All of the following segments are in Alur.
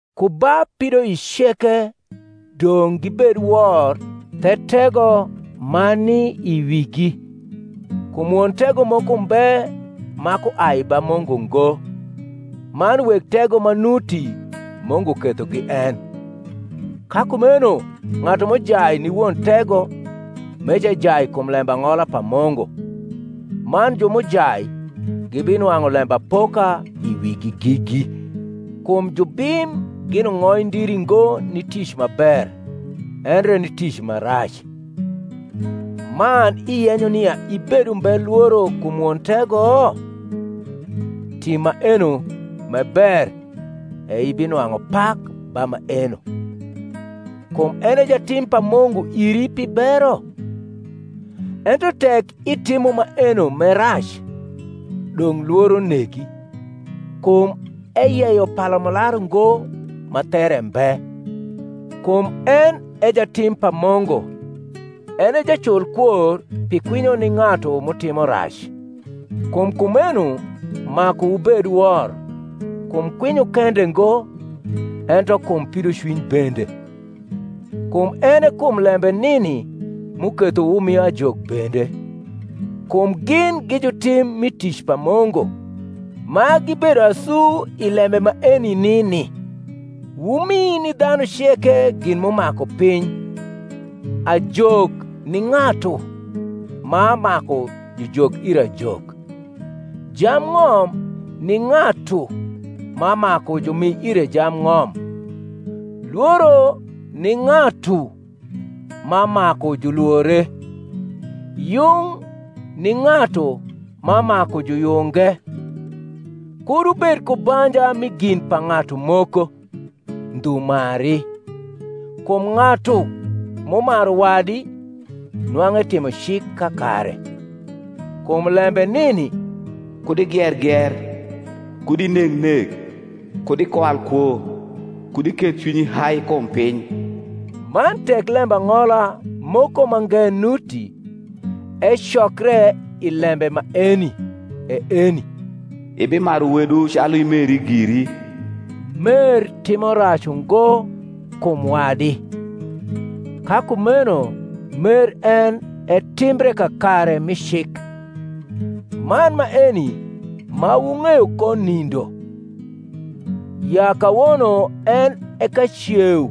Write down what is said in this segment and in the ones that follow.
Ku ba pidoic ceke dong’ gibed wor the tego ma ni i wigi: kum won tego moko mbe ma kuai ba Mungu ngo: man weg tego ma nuti Mungu kethogi en. Ka kumeno ng’atu m’ujai ni won tego, meca ejai kum lembang’ola pa Mungu: man ju m’ujai gibinwang’u lembapoka i wigi gigi. Kum jubim gin ung’oindiri ngo ni tic ma ber, endre ni tic ma rac. Man iyenyo nia ibed umbe lworo kum won tego? tim maeno m’e ber, e ibinwang’u pak ba maeno: kum en e jatim pa Mungu iri pi bero. Ento tek itimo maeno m’e rac, dong’ lworo negi; kum eyeyo palamularu ngo ma there mbe: kum en e jatim pa Mungu, en e jaculkwor pi kwinyo ni ng’atu m’utimo rac. Kum kumeno maku wubed wor, kum kwinyo kende ngo, ento kum pidocwiny bende. Kum en e kum lembe nini m’uketho wumio ajok bende; kum gin gi jutim mi tic pa Mungu, ma gibedo asu i lembe maeni nini. Wumi ni dhanu ceke gin m’umaku piny; ajok ni ng’atu ma maku jujok ire ajok; jambng’om ni ng’atu ma maku jumi ire jambng’om; lworo ni ng’atu ma maku julwore; yung ni ng’atu ma maku juyunge. Kud wubed ku banja mi gin pa ng’atu moko, ndhu mari: kum ng’atu m’umaru wadi nwang’u etimo cik kakare. Kum lembe nini, Kud igier gier, Kud ineg nek, Kud ikwal kwo, Kud iketh cwinyi hai kum piny, man tek lembang’ola moko mange nuti, ecokre i lembe maeni, e eni, Ibimaru wedu calu imeri giri. Mer timo rac ungo kum wadi: ka kumeno mer en e timbre kakare mi cik. Man maeni, ma wung’eyo ko nindo, ya kawono en e kaceu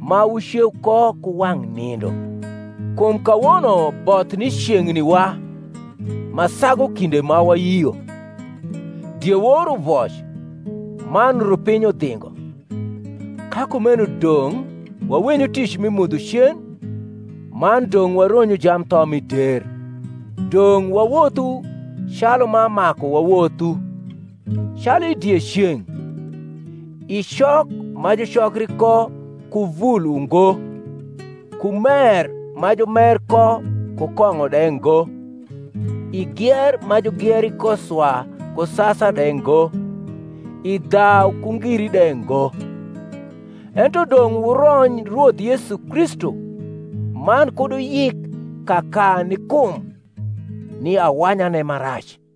ma wuceu ko ku wang’ nindo: kum kawono both ni ceng’ni wa ma sagu kinde ma wayio. Diewor uvoc, man rupiny udhingo: ka kumeno dong’ wawenyu tic mi mudho cen, man dong’ waronyu jamtho mi der. Dong’ wawothu calu ma maku wawothu, calu i dieceng’; i cok ma jucokri ko ku vul ungo ku mer ma jumer ko ku kong’o de ngo, i gier ma jugieri ko swa ku sasa de ngo, i dhau ku ngiri de ngo. Ento dong’ wurony Rwoth Yesu Kristu, man kud wuyik kaka ni kum, ni awanyane ma rac.